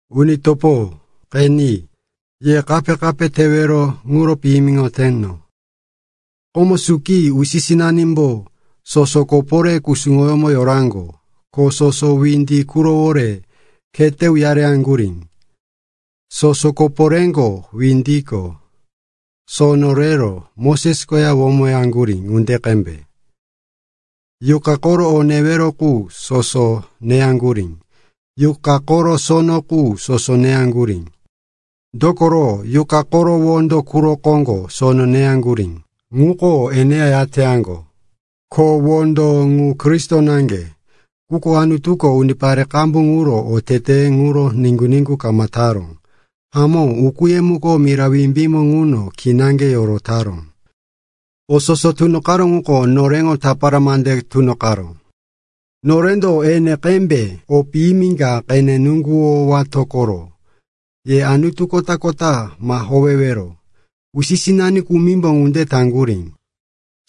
Uni topo, qeni, ye kape-kape tewero ŋuro piyimiŋoteno. Komo suki, usi-sinanimbo soso koporé kusuŋoyómo yoraŋgo, ko soso windi qurowore khete uyareŋgurí. Soso koporéko, windiko sono rero Moses koya womaŋgurí ŋunde qembe. Yuqa koro o newero qu soso neyaŋgurí. Yuqa koro sono qu soso neyaŋgurí. Dokoro yuqa koro wondo quro koŋgo sono neyaŋgurí, ŋuko eneya yateyaŋgo. Ko wondo ŋu Kristo naŋge. Quko Anutuko unipare qambu quro oteteye ŋuro niŋgu-niŋgu kama taró. Hamó, ukúye muko mira wimbímo ŋuno kinaŋge yorotaró. O soso tunoqaró ŋuko noreŋo tapara mande tunoqaró. Norendo ene qembe o piyimi ka qene nuŋguwowato koro. Ye anutu kota-kota ma howewero. Usi-sinani kumimbo ŋunde taŋgurí.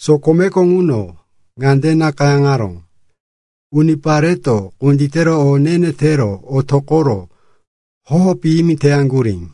Sokomeko ŋuno ŋande nakayáŋaró, “Unipareto kunditero o ne-ne tero otoqoro hoho piyimi teyaŋgurí.”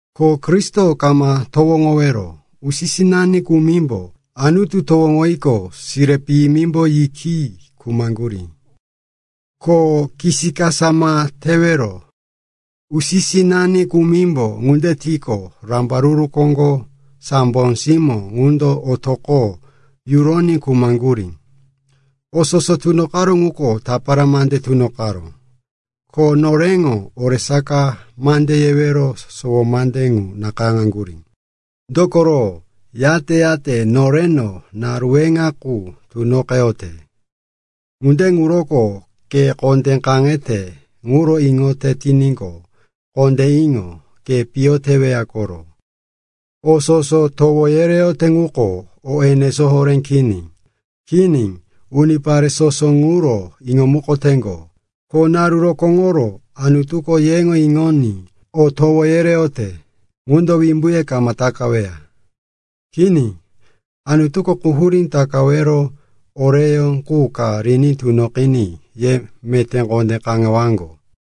Ko Kristo ma towoŋowero. Usi-sinani kumimbo Anutu towoŋoyiqo, sire piyimimbo yikiyi khumaŋgurí. Ko kisikasa ma tewero. Usi-sinani kumimbo ŋunde tiqo rambaruru koro sambo simó ŋundo otoqo yuroní khumaŋgurí. O soso tunoqaró ŋuko tapara mande tunoqaró. Ko noreŋo oresaka mande yewero sowo mande ŋu nakayáŋaŋgurí. Dokoro yate-yate noreno naru weŋa qu tunoqeyote. Ŋunde ŋuroko ke kondé kaŋete ŋuro iŋoyote tiníqo, kondé iŋo. Ke piyo teweya koro. O soso towo yereyote ŋuko o enesó horé kini. Kini, unipare soso ŋuro iŋomukoteŋgo. Ko naru rokóŋo Anutuko yeŋo iŋoní o towo yereyote ŋundo wimbuye kama takaweya. Kini, Anutuko quhurí takawero oreyó qu ka riní tunoqiní ye meté kondé kaŋewaŋgo.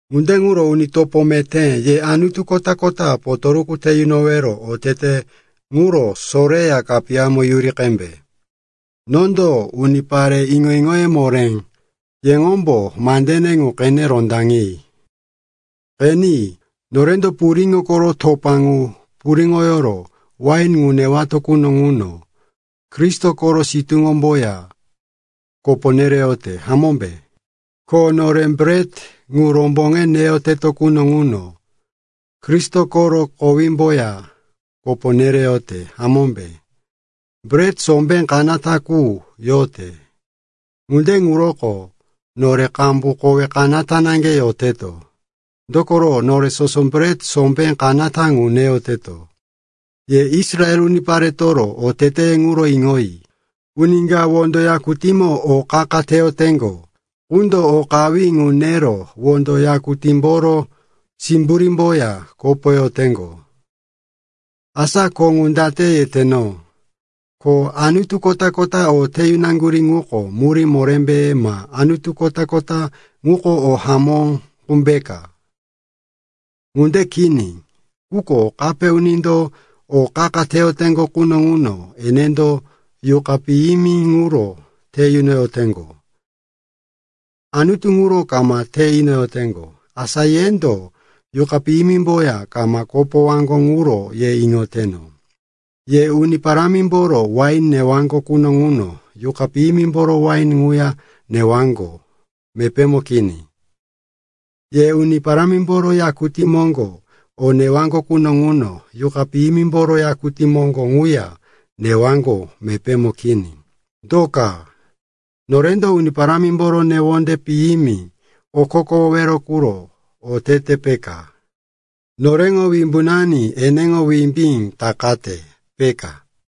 Ŋunde ŋuro, uni topo meté, ye anutu kota-kota potoruku te yunowero otete ŋuro soreya kapiyamo yuri qembe. Nondo unipare iŋo-iŋoye moré; yeŋombo mandene ŋu qene rondaŋi. Qeni, norendo puriŋo koro topa ŋu puriŋoyoro wain ŋu newato quno ŋuno Kristo koro sitúŋomboya kopo nereyote, hamómbe? Ko nore bret ŋu romboŋe neyoteto quno ŋuno Kristo koro kowímboya kopo nereyote, hamómbe? Bret sombé kanata qu yote; ŋunde ŋuroko nore qambu kowe kanata naŋge yoteto, dokoro nore soso bret sombé kanata ŋu neyoteto. Ye Israel uniparetoro oteteye ŋuro iŋoyi. Uni ka wondo yakutímo o qa-qa teyoteŋgo qundo o qawí ŋu nero wondo yakutímboro simburímboya kopoyoteŋgo? Asa ko ŋu date yeteno, ko anutu kota-kota o te yunaŋgurí ŋuko murí morémbe, ma anutu kota-kota ŋuko o hamó qumbe peka? Ŋunde kini. Quko kape unindo o qa-qa teyoteŋgo quno ŋuno enendo yuqa piyimi ŋuro te yunoyoteŋgo. Anutu ŋuro kama te inoyoteŋgo. Asa yendo yuqa piyimimboya kama kopowaŋgo ŋuro ye iŋoteno. Ye Uni Parámimboro wain newaŋgo quno ŋuno yuqa piyimimboro wain ŋuya newaŋgo mepémo kini. Ye Uni Parámimboro yakutí moŋgo o newaŋgo quno ŋuno yuqa piyimimboro yakutí moŋgo ŋuya newaŋgo mepémo kini. Do ka? Norendo Uni Parámimboro newonde piyimi okokowowero quro teteto, peka? Noreŋo wimbunani eneŋo wimbí takate, peka?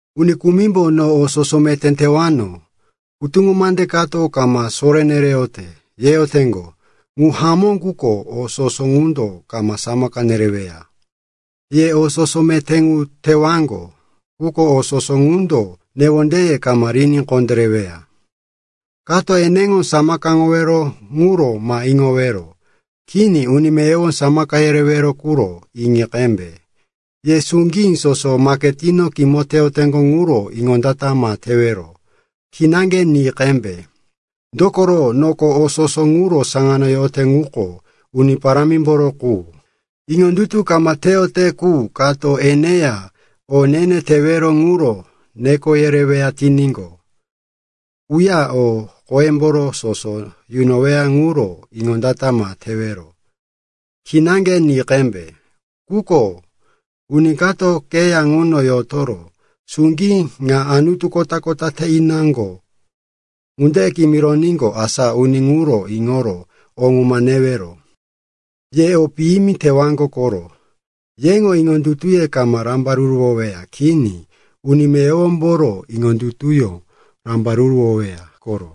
Uni kumimbo, “No o soso meté tewano, hutuŋo mande kato kama soré nereyote,” yeyoteŋgo. Ŋu hamó, quko o soso ŋundo kama samaka yereyoweya. Ye o soso meté ŋu tewaŋgo, quko o soso ŋundo newondeye kama riní kondéreweya. Kato eneŋo samakaŋowero ŋuro ma iŋowero. Kini. Uni meyowo samaka yerewero ŋuro iŋi qembe. Ye suŋgí soso maketino kimoyoteŋgo ŋuro iŋondata ma tewero. Kinaŋge ni qembe. Dokoro “noko, o soso ŋuro saŋano yote ŋuko Uni Parámimboro qu.” Iŋondutu kama teyote qu kato eneya o ne-ne tewero ŋuro neko yereweya tiníqo, uya o qoyemboro soso yunoweya ŋuro iŋondata ma tewero. Kinaŋge ni qembe. Quko uni kato keya ŋuno yotoro, “Suŋgí ŋa anutu kota-kota te inaŋgo,” ŋunde kimironíqo, asa uni ŋuro iŋoro o ŋu ma newero. Ye o piyimi tewaŋgo koro. Yeŋo iŋondutuye kama rambaruruwoweya, kini. Uni meyowomboro iŋondutuyó rambaruruwoweya koro.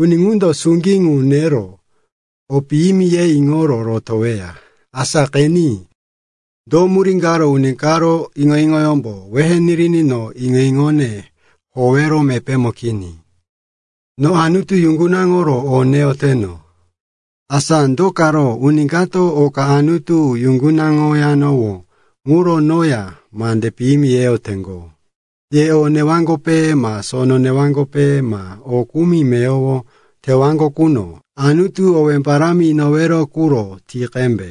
Uni ŋundo suŋgí ŋu qenero, o piyimi, ye iŋoro rotoweya. Asa qeni, do murí karo uni karo iŋo-iŋoyómbo wehe niriní no iŋo-iŋone howero mepémo kini? No Anutu yuŋgunaŋoro o neyoteno. Asa do karo uni kato oka Anutu yuŋgunaŋoyanowó ŋuro noya mande piyimi yeyoteŋgo? Ye o newaŋgope ma sono newaŋgope ma o kumi meyowo tewaŋgo quno, Anutu owé parámi inowero quro ti qembe.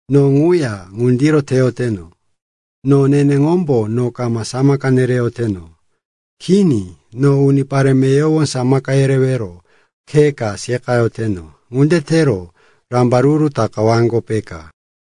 No ŋuya ŋundiro teyoteno. No neneŋombo no kama samaka nereyoteno. Kini, no unipare meyowo samaka yerewero khe ka seqayoteno. Ŋunde tero rambaruru takawaŋgo, peka.